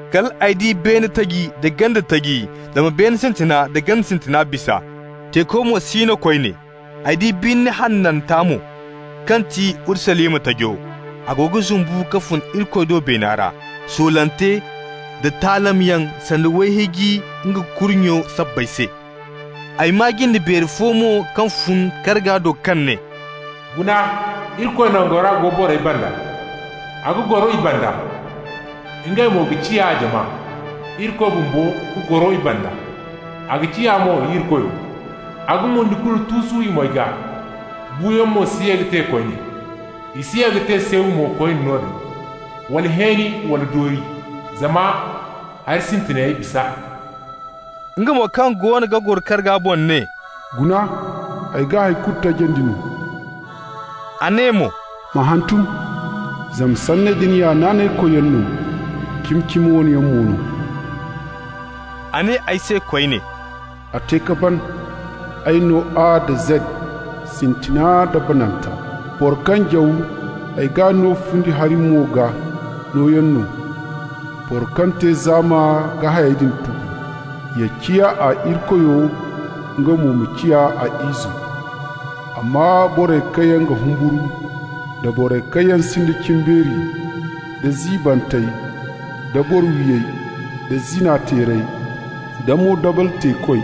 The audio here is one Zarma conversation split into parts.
Kal ay di beene taji da ganda taji, zama beene sintina nda ganda sintina bisa, teeko mo si no koyne. Ay di birni hananta mo, kaŋ ti Urusalima tajo. A go ga zumbu ka fun Irikoy do beena ra, soolante nda taalamyaŋ sanda wayhiiji nga kurnyo sabbay se. Ay maa jinde beeri fo mo kaŋ fun karga do kaŋ ne: «Guna, Irikoy nangora go borey banda. A ga goro i banda, ngey mo ga ciya a jama. Irikoy bumbo ga goro i banda, a ga ciya mo i Irikoyo. A ga mundi kulu tuusu i moy gaa, buuyaŋ mo si ye ka te koyne. I si ye ka te seew mo koyne noodin, wala hẽeni wala doori, zama hari sintinayey bisa.» Nga mo kaŋ goono ga goro karga boŋ ne: «Guna, ay ga hay kulu tajandi no.» A ne mo: «Ma hantum, zama sanney din ya naanaykoyyaŋ no, cimi-cimi wane yaŋ mo no.» A ne ay se koyne: «A te ka ban! Ay no A nda Zed, Sintina nda Bananta. Boro kaŋ jaw, ay g'a no fundi hari-mo gaa, nooyaŋ no. Boro kaŋ te zaama ga hayey din tubu. Ya ciya a Irikoyo, nga mo ma ciya ay izo. Amma borey kaŋ yaŋ ga humburu, da borey kaŋ yaŋ sinda cimbeeri, da ziibantey, da boro-wiyey, da zina-teerey, da moodabal-teekoy,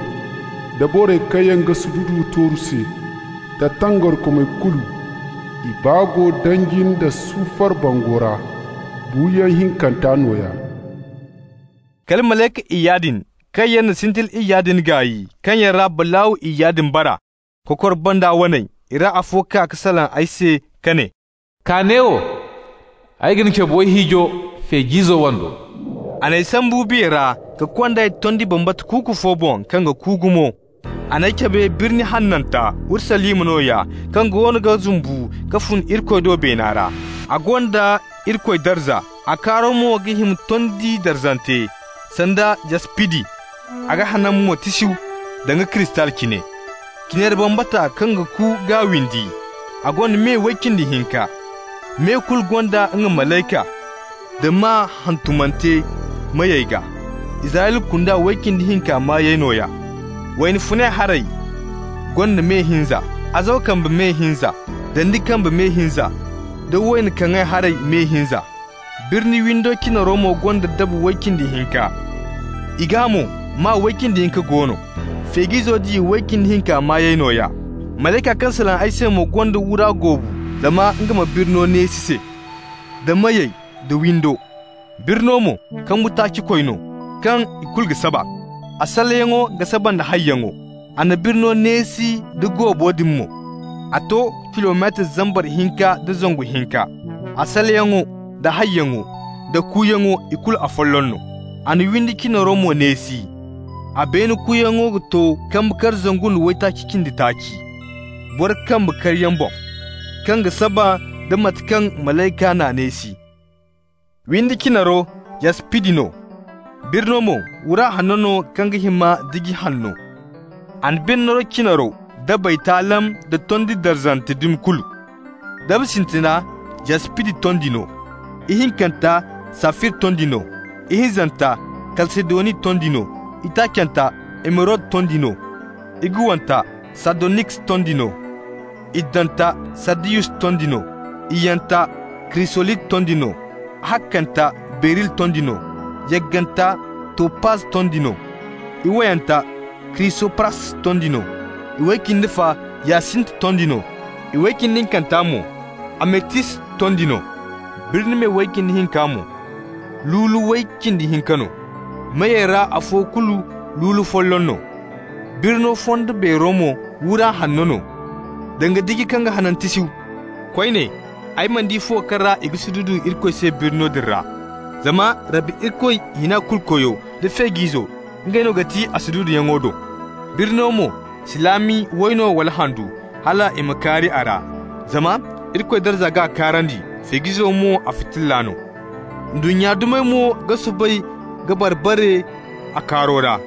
da borey kaŋ yaŋ ga sududu tooru se, da tangarikomey kulu, i baa go danji nda sufar bango ra, buuyaŋ hinkanta nooya.» Kal malayka iyya din, kaŋ yaŋ na sintili iyya din gaay, kaŋ yaŋ ra balaaw iyya din bara, kokor banda waney, i ra afo kaa ka salaŋ ay se ka ne: «Kaa neewo. Ay ga ni cabe wayhiijo, Feej'izo wando.» A n'ay sambu biya ra ka kond'ay tondi bambata kuuku fo boŋ kaŋ ga ku gumo. A n'ay cabe birni hananta, Urusalima nooya, kaŋ goono ga zumbu ka fun Irikoy do beena ra. A gonda Irikoy darza, a kaaro mo ga hima tondi darzante, sanda yaspidi, a ga hanan mo tisiyu danga kristal cine. Cinari bambata kaŋ ga ku g'a windi. A gonda me way cindi hinka. Me kulu gonda nga malayka, da maa hantumante meyey gaa, Israyla kunda way cindi hinka maayey nooya. Wayna funay haray gonda me hinza, azawa kambe me hinza, dandi kambe me hinza, da wayna kaŋay haray me hinza. Birni windo cinaro mo gonda daba way cindi hinka, i gaa mo maa way cindi hinka go no, Feej'izo diya way cindi hinka waney nooya. Malayka kaŋ salaŋ ay se mo gonda wura goobu zama nga ma birno neesi se, d'a meyey, d'a windo. Birno mo kambu-taaci-koy no, kaŋ ikulu ga saba, a salleyaŋo ga saba nd'a hayyaŋo. A na birno neesi nda goobo din mo, a to kilometar zambar hinka nda zangu hinka. A salleyaŋo, d'a hayyaŋo, d'a kuuyaŋo, ikulu afolloŋ no. A na windi cinaro mo neesi. A beene kuuyaŋo to kambe kar zangu nda waytaaci cindi taaci, boro kambe karyaŋ boŋ, kaŋ ga saba nda mate kaŋ malayka n'a neesi. Windi cinaro yaspidi no, birno mo wura hanno no kaŋ ga hima diji hanno. A na birno cinaro dabey taalam da tondi darzante dumi kulu. Daba sintina yaspidi tondi no, ihinkanta safir tondi no, ihinzanta kalsedoni tondi no, itaacanta emerod tondi no, iguwanta sardoniks tondi no, iddanta sardiyus tondi no, iyyanta krisolit tondi no, ahakkanta beril tondi no, yagganta topaz tondi no, iwayanta krisopras tondi no, iway cindi fa yasint tondi no, iway cindi hinkanta mo ametist tondi no. Birni me way cindi hinka mo lulu way cindi hinka no, meyey ra afo kulu lulu folloŋ no. Birno fondo beero mo wura hanno no, danga diji kaŋ ga hanan tisiyu. Koyne, ay mana di fuwo kaŋ ra i ga sududu Irikoy se birno din ra, zama Rabbi Irikoy, Hina-Kulu-Koyo, da Feej'izo, ngey no ga ti a sududuyaŋo do. Birno mo si laami wayno wala handu, hal i ma kaari a ra, zama Irikoy darza g'a kaarandi, Feej'izo mo a fitilla no. Ndunnya dumey mo ga soobay ka bar-bare a kaaro ra.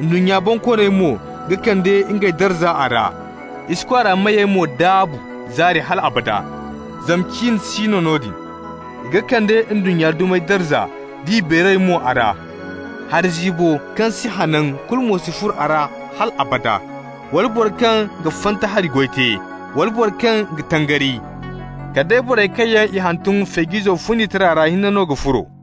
Ndunnya bonkooney mo ga kande ngey darza a ra. I si kwaara meyey mo daabu zaari hal abada (zama cin si no noodin). I ga kande ndunnya dumey darza nd'i beeray mo a ra. Hari ziibo kaŋ si hanan kulu mo si furo hal abada, wala boro kaŋ ga fanta hari goy te, wala boro kaŋ ga tangari. Kala day borey kaŋ yaŋ i hantum Feej'izo fundi tira ra hinne no ga furo.